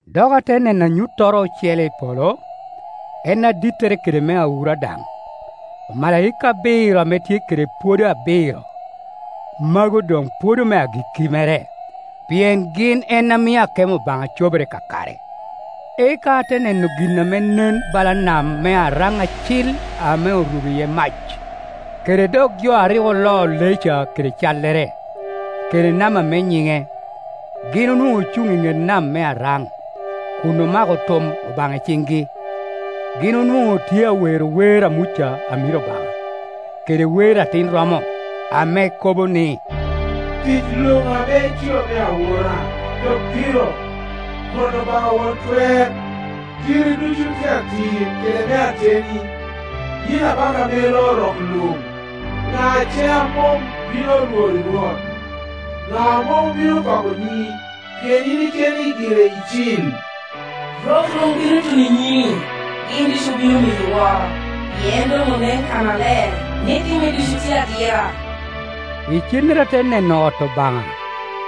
Dok ate neno anyuttoro ocele i polo, en adittere kede me awura daŋ, omalaika abiro ame tye kede pwodo abiro. Mago doŋ pwodo me agikki mere, pien gin en a mio akemo Obaŋa cobere kakare. Eka ate neno gin ame nen bala nam me aryeny acil ame orubo iye mac, kede dok jo a rik oloo lee ca kede callere, kede namba me nyine; gin onwoŋo ocuŋ i ŋet nam me araŋ, kun omako tum Obaŋa i ciŋgi. Gin onwoŋo otye a wero wer a Muca amiro Obaŋa, kede wer Atin romo, ame kobo ni, “Tic luŋ ame itio me awura, dok dito, Rwot Obaŋa Won Twer! Kitti ducu tye atir kede me ateni, yin Abaka ame loo rok luŋ! Ŋa ce a mom bino lwori Rwot? Ŋa a mom bino pako nyiŋi? Pien yin keni giri icil. Rok luŋ bino tuno i nyimi, gin ducu obino miyi woro, pien doŋ onen oko kannaler ni timmi ducu tye atira.” Icennere ate neno ot Obaŋa,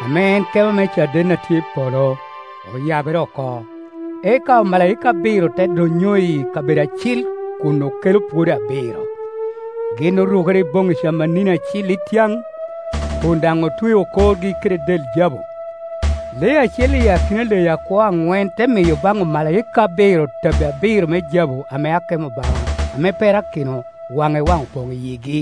ame en kema me caden a tye i polo, oyabere oko, eka omalaika abiro te donnyo iyi kabedo acil kun okelo pwodo abiro. Gin orukere i boŋŋi camanini acil ityaŋ, kun daŋ otweo korgi kede del jabu. Lee acel i akina leyi akwo aŋwen te miyo baŋ omalaika abiro tabbi abiro me jabu ame akemo Obaŋa ame perakino waŋ i waŋ opoŋ i yigi.